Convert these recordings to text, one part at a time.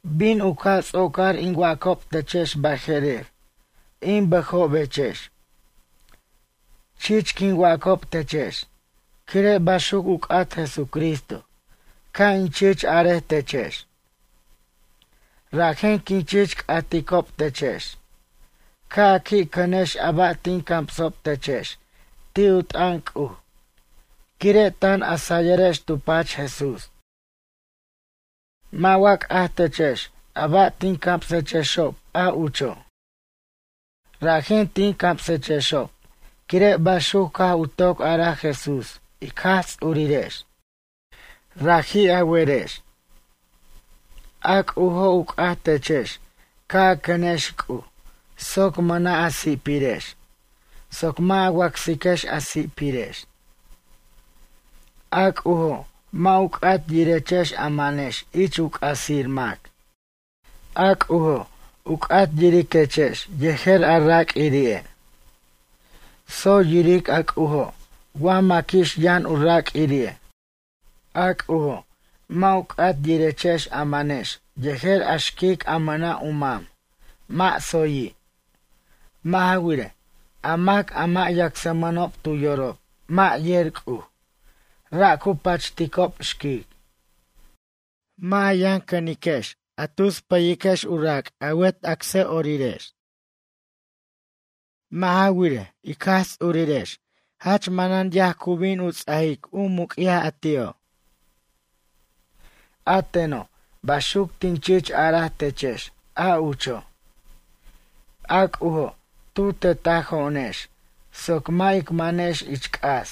Bin u ca' ts'ocar in wacob techex baje'rer, in bʌjobechex. Chich quin wacob techex quire' baxuc u c'at Jesucristo ca' in chich arej techex. Rajen quin chich c'aticob techex ca' a qui' cʌnex a ba' tin camsob techex ti' u t'ʌn C'uj quire' tan a sayʌrex tu pach Jesús. Mʌ' wa c'aj techex a ba' tin camsexob, a ucho'? Rajen tin camsechexob quire' baxuc caj u toc araj Jesús ic Jaj Ts'urirex. Raji' a werex. A C'ujo' u c'at techex ca' a cʌnex C'uj soc mʌna' a si'pirex, soc mʌ' a wacsiquex a si'pirex. A C'ujo' mʌ' u c'at yirechex a manex ich u c'asir mac. A C'ujo' u c'at yiriquechex yejer a raq'uiri'e'. Tsoy yiric a C'ujo' wa maquix yʌn u raq'uirire'. A C'ujo' mʌ' u c'at yirechex a manex yejer a xquic a mʌna' u mam, mʌ' tsoyi'. Mʌ' ja wirej, a mac a mʌ' yacsmʌnob tu yorob mʌ' yer C'uj, ra' cu pachticob xquic. Mʌ' a yʌn cʌniquex a tus pʌyiquex u rac' a wet acsʌ'orirex. Mʌ' ja wirej, ic Jaj Ts'urirex jach manan yaj cu bin u ts'ajic muc'yaj a ti'o'. A teno' baxuc tin chich araj techex a ucho'. A C'ujo' tu tetajo'onex soc mʌ' ic manex ich c'as.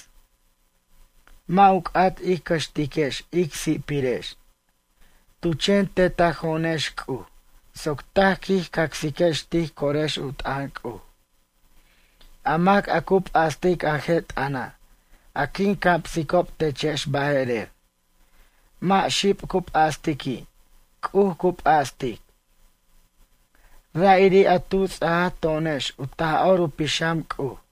Mʌ' u c'at ij cʌxtiquex ic si'pirex. Tu chen tetajo'onex C'uj soc taj quij cacsex tij corex u t'ʌn C'uj. A mac a cu p'astic a je' t'ʌna', a quin camsicob techex baje'rer. Mʌ' xib cu p'astiqui', C'uj cu p'astic. Ra'iri' a tu ts'aj to'onex u Taj'or u Pixam C'uj.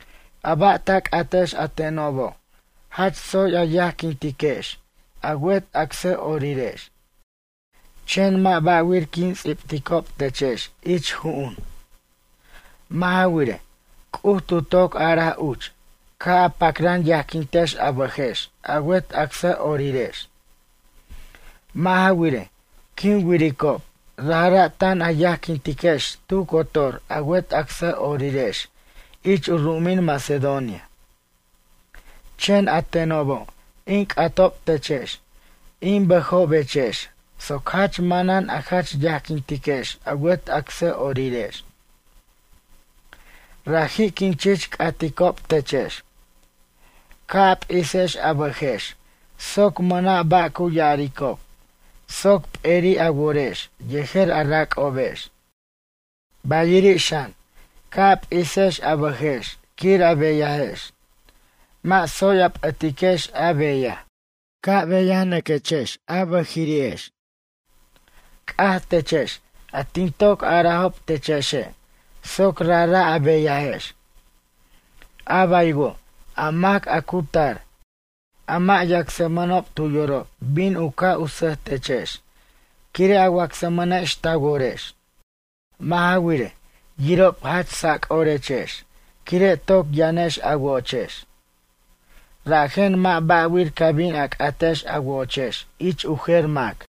A ba' ta c'atex a tenobo' jach tsoy a yajquintiquex a wet acsʌ'orirex. Chen mʌ' ba'wir quin ts'ibticob techex ich ju'un. Mʌ' ja wirej, C'uj tu toc araj uch ca' a pacran yajquintex a bʌjex a wet acsʌ'orirex. Mʌ' ja wirej, quin wiricob rajra' tan a yajquintiquechex tu cotor a wet acsʌ'orirex ich u ru'umin Macedonia. Chen a tenobo' in c'atob techex, in bʌjobechex soc jach manan a jach yajquintiquex a wet acsʌ'orirex. Raji' quin chich c'aticob techex. Ca' a p'isex a bʌjex soc mʌna' ba' cu ya'aricob soc p'eri'i' a worex yejer a rac'obex. Bayiri' xan, ca' a p'isex a bʌjex quir a beyajex. Mʌ' tsoy a p'ʌtiquex a beyaj. Ca' a beyanʌquex a bʌjiri'ex. C'aj techex a tin toc arajob techexe' soc rajra' a beyajex. A baywo' a mac a cu tar, a mʌ' yacsmʌnob tu yorob bin u ca' sʌj techex quire' a wacsmʌnex ta worex. Mʌ' ja wirej, yirob jach sac'orechex quire' toc yʌnex a wo'ochex. Rajen mʌ' ba' wir ca bin a c'atex a wo'ochex ich u jer mac.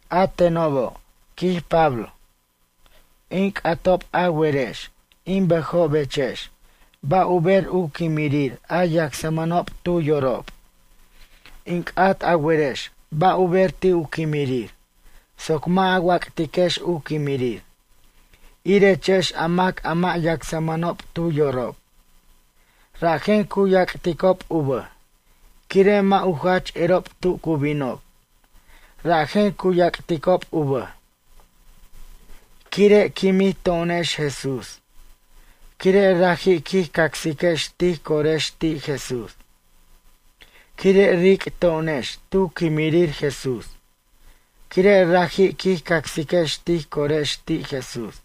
A tenobo', quij Pablo. In c'atob a werex, in bʌjobechex ba' u ber u quimrir a yacsmʌnob tu yorob. In c'at a werex ba' u ber ti' u quimrir soc mʌ' a wac'tiquex u quimrir, irechex a mac a mʌ' yacsmʌnob tu yorob. Rajen cu yac'ticob u bʌj quire' mʌ' u jach erob tu cu binob, rajen cu yac'ticob u bʌj. Quire' quimij to'onex Jesús quire' raji' quij cacsiquex tij corex ti' Jesús. Quire' ric' to'onex tu quimrir Jesús quire' raji' quij cacsiquex tij corex ti' Jesús.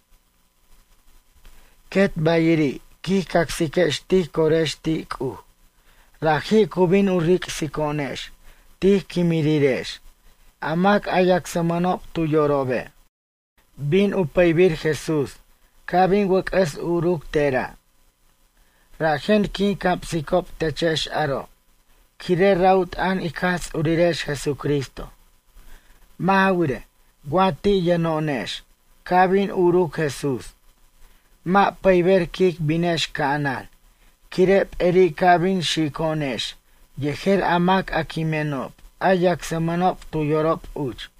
Quet bayiri' quij cacsiquex tij corex ti' C'uj, raji' cu bin u ric'so'onex tij quimrirex a mac a yacsmʌnob tu yorobe'. Bin u pʌybir Jesús ca' bin wʌc'ʌs uruc tera'. Rajen quin camsicob techex aro', quire' ra' u t'ʌn ic Jaj Ts'urirex Jesucristo. Mʌ' ja wirej, wa ti' yʌno'onex ca' bin uruc Jesús. Mʌ' pʌyber quic binex ca'anan quire' p'eri' ca' bin xico'onex yejer a mac a quimenob a yacsmʌnob tu yorob uch.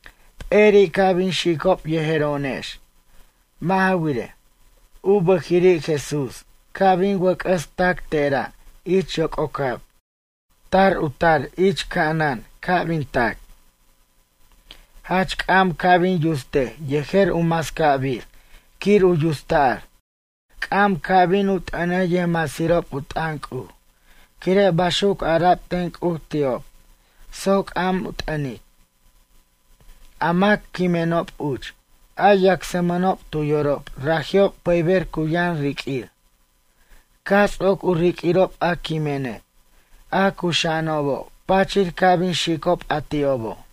P'eri' ca' bin xicob yejero'onex. Mʌ' ja wirej, u bʌjiri' Jesús ca' bin wʌc'ʌs tac tera' ich yoc'ocab. Ta u tar ich ca'anan ca' bin tac. Jach c'am ca' bin yustej yejer u mascabir quir u yutsta'r. C'am ca' bin u t'ʌnej yʌjmasirob u t'ʌn C'uj quire' baxuc ara'b ten C'uj ti'ob soc c'am u t'ʌnic. A mac quimenob uch, a yacsmʌnob tu yorob raji'ob pʌyber cu yʌn riq'uir. Caj ts'oc u riq'uirob a quimene', a cuxa'anobo' pachir ca' bin xicob a ti'obo'.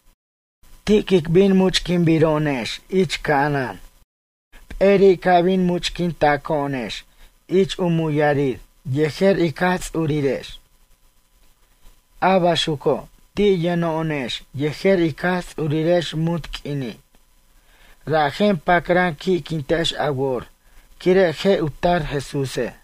Ti' quic bin ic much'quinbiro'onex ich ca'anan. P'eri' ca' bin much'quintaco'onex ich u muyarir yejer ic Jaj Ts'urirex. A baxuco' ti' yʌno'onex yejer ic Jaj Ts'urex munt q'uini'. Rajen pacran qui'quintex a wor quire' je' tar Jesúse'.